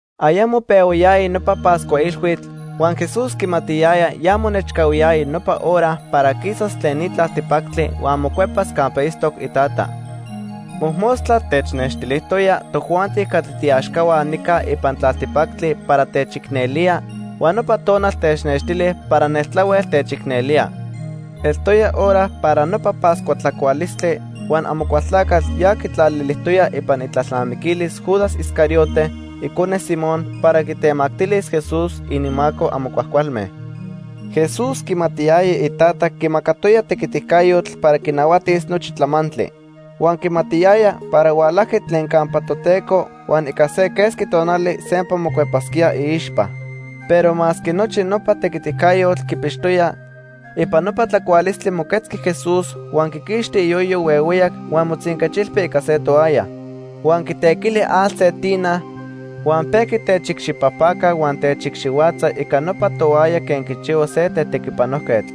Ayamo pehuayaya nopa Pascua Ilhuitl, huan Jesús quimatiyaya ya monechcahuiyaya nopa hora para quisas tlen ni tlaltipactli huan mocuepas campa itztoc iTata. Mojmostla technextilijtoya tojuanti catli tiiaxcahua nica ipan tlaltipactli para techicnelía, huan nopa tonal technextili para neltlahuel techicnelía. Eltoya hora para nopa Pascua tlacualistli huan Amocualtlacatl ya quitlalilijtoya ipan itlalnamiquilis Judas Iscariote, icone Simón, para quitemactilis Jesús ininmaco amo cuajcualme. Jesús quimatiyaya iTata quimacatoya tequiticayotl para quinahuatis nochi tlamantli. Huan quimatiyaya para hualajqui tlen campa Toteco huan ica se quesqui tonali sempa mocuepasquía iixpa. Pero masque nochi nopa tequiticayotl quipixtoya, ipan nopa tlacualistli moquetzqui Jesús huan quiquixti iyoyo huehueyac huan motzinquechilpi ica se toalla. Huan quitequili atl se tina, huan pejqui techicxipajpaca huan techicxihuatza ica nopa toalla quen quichihua se tetequipanojquetl.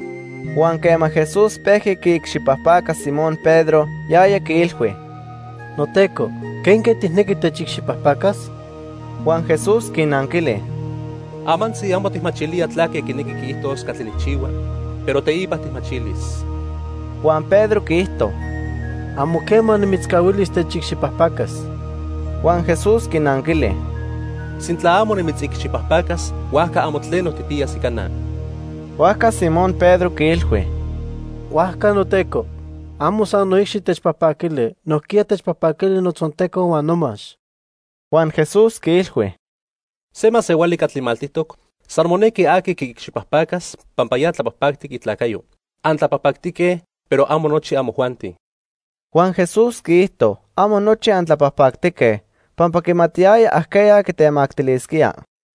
Huan quema Jesús pejqui quiicxipajpaca Simón Pedro, yaya quiilhui: —NoTeco, ¿quenque tijnequi techicxipajpacas? Huan Jesús quinanquili: —Amantzi amo tijmachilía tlaque quinequi quiijtos catli nijchihua, pero teipa tijmachilis. Huan Pedro quiijto: —Amo quema nimitzcahuilis techicxipajpacas. Huan Jesús quinanquili: —Sintla amo nimitzicxipajpacas, huajca amo tleno tijpiyas ica na. Huajca Simón Pedro quiilhui: —Huajca, noTeco, amo san noicxi techpajpaquili, nojquiya techpajpaquili notzonteco huan nomax. Huan Jesús quiilhui: —Se masehuali catli maltijtoc, san monequi aqui quiicxipajpacas pampa ya tlapajpactic itlacayo. Antlapajpactique, pero amo nochi amojuanti. Huan Jesús quiijto: "Amo nochi antlapajpactique", pampa quimatiyaya ajqueya quitemactilisquía.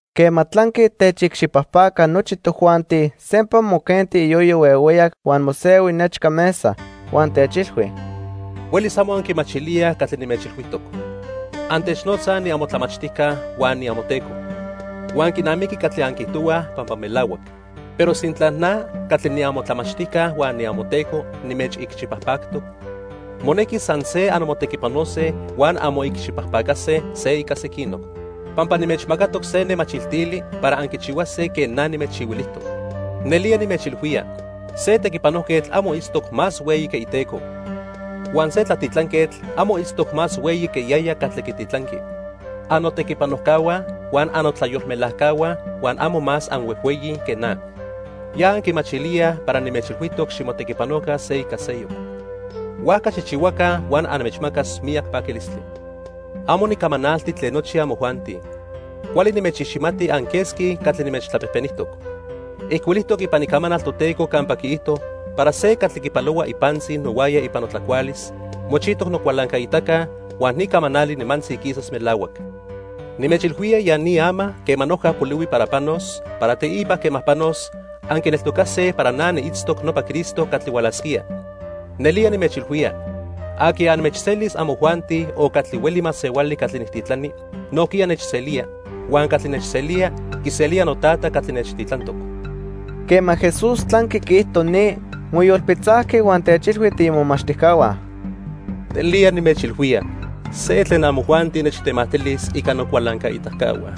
Quema tlanqui techicxipajpaca nochi tojuanti, sempa moquenti iyoyo huehueyac huan mosehui nechca mesa. Huan techilhui: —Huelis amo anquimachilíaj catli nimechchihuilijtoc. Antechnotzaj niamotlamachtijca huan niamoTeco. Huan quinamiqui catli anquiijtohuaj pampa melahuac. Pero sintla na catli niamotlamachtijca huan niamoTeco nimechicxipajpactoc, monequi san se anmotequipanose huan anmoicxipajpacase se ica sequinoc. Pampa nimechmacatoc se nemachiltili para anquichihuase quen na nimechchihuilijtoc. Nelía nimechilhuía, se tequipanojquetl amo itztoc más hueyi que iteco. Huan se tlatitlanquetl amo itztoc más hueyi que yaya catli quititlanqui. Annotequipanojcahua huan annotlayolmelajcahua huan amo más anhuejhueyi que na. Ya anquimachilíaj para nimechilhuijtoc ximotequipanoca se ica seyoc, huajca xijchihuaca huan anmechmacas miyac paquilistli. "Amo nicamanalti tlen nochi amojuanti. Cuali nimechiximati anquesqui catli nimechtlapejpenijtoc. Ijcuilijtoc ipan Icamanal Toteco campa quiijto para se catli quipalohua ipantzi nohuaya ipan notlacualis, mochijtoc nocualancaitaca, huan ni camanali nimantzi quisas melahuac. Nimechilhuía ya ni ama quema noja polihui para panos, para teipa quema panos, anquineltocase para na niitztoc nopa Cristo catli hualasquía. Nelía nimechilhuía, aqui anmechselis amojuanti o catli hueli masehuali catli nijtitlani, nojquiya nechselía, huan catli nechselía, quiselía noTata catli nechtitlantoc." Quema Jesús tlanqui quiijto ni, moyolpitzajqui huan techilhui tiimomachtijcahua: —Nelía nimechilhuía, se tlen amojuanti nechtemactilis ica nocualancaitacahua.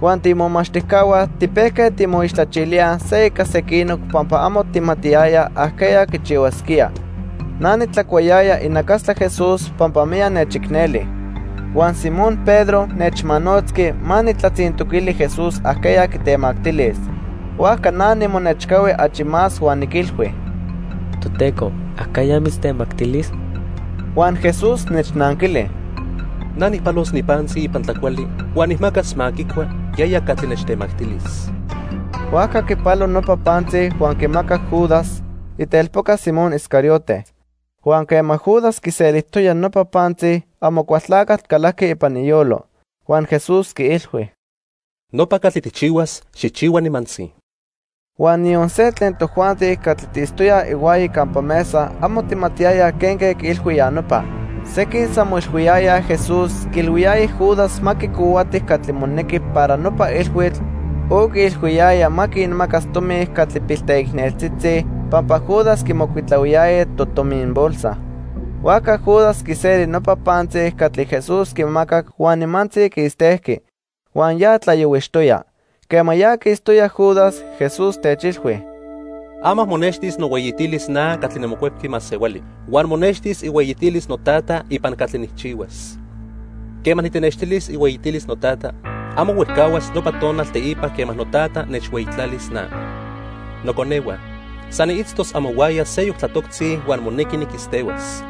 Huan tiimomachtijcahua tipejque timoixtlachilíaj se ica sequinoc pampa amo tijmatiyayaj ajqueya quichihuasquía. Na nitlacuayaya inacastla Jesús pampa miyac nechicneli. Huan Simón Pedro nechmanotzqui ma nijtlatzintoquili Jesús ajqueya quitemactilis. Huajca na nimonechcahui achi más huan niquilhui: —Toteco, ¿ajqueya mitztemactilis? Huan Jesús nechnanquili: —Na nijpalos ni pantzi ipan tlacuali huan nijmacas ma quicua yaya catli nechtemactilis. Huajca quipalo nopa pantzi huan quimacac Judas, itelpoca Simón Iscariote. Huan quema Judas quiselijtoya nopa pantzi, Amocualtlacatl calajqui ipan iyolo. Huan Jesús quiilhui: —Nopa catli tijchihuas, xijchihua nimantzi. Huan niyon se tlen tojuanti catli tiitztoyaj ihuaya campa mesa amo tijmatiyayaj quenque quiilhui ya nopa. Sequin san moilhuiyayaj Jesús quiilhuiyaya Judas ma quicohuati catli monequi para nopa ilhuitl o quiilhuiyaya ma quinmacas tomi catli pilteicneltzitzi pampa Judas quimocuitlahuiyaya totominbolsa. Huajca Judas quiseli nopa pantzi catli Jesús quimacac huan nimantzi quistejqui. Huan ya tlayohuixtoya. Quema ya quistoya Judas, Jesús techilhui: —Ama monextis nohueyitilis na catli niMocuepqui Masehuali. Huan monextis ihueyitilis noTata ipan catli nijchihuas. Quema nitenextilis ihueyitilis noTata, amo huejcahuas nopa tonal teipa quema noTata nechhueyitlalis na. Noconehua, san niitztos amohuaya seyoc tlatoctzi huan monequi niquistehuas.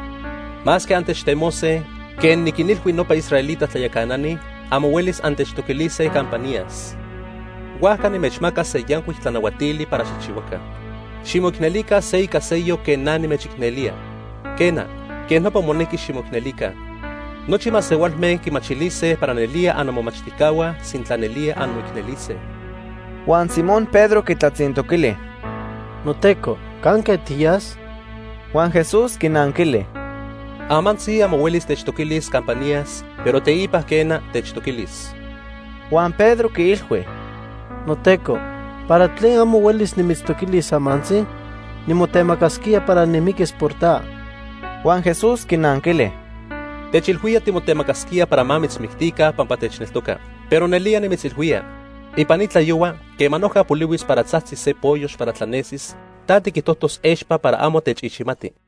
Masque antechtemose, quen niquinilhui nopa israelita tlayacanani, amo huelis antechtoquilise campa niyas. Huajca nimechmaca se yancuic tlanahuatili para xijchihuaca: Ximoicnelica se ica seyoc quen na nimechicnelía. Quena, quej nopa monequi ximoicnelica. Nochi masehualme quimachilise para nelía annomomachtijcahua sintla nelía anmoicnelise. Huan Simón Pedro quitlatzintoquili: —NoTeco, ¿canque tiyas? Huan Jesús quinanquili: —Amantzi amo huelis techtoquilis campa niyas, pero teipa quena, techtoquilis. Huan Pedro quiilhui: —NoTeco, ¿para tlen amo huelis nimitztoquilis amantzi? Nimotemacasquía para nimiquis por ta. Huan Jesús quinanquili: —Techilhuía timotemacasquía para ma mitzmictica pampa techneltoca. Pero nelía nimitzilhuía, ipan ni tlayohua quema noja polihuis para tzajtzis se poyox para tlanesis, ta tiquijtojtos expa para amo techiximati.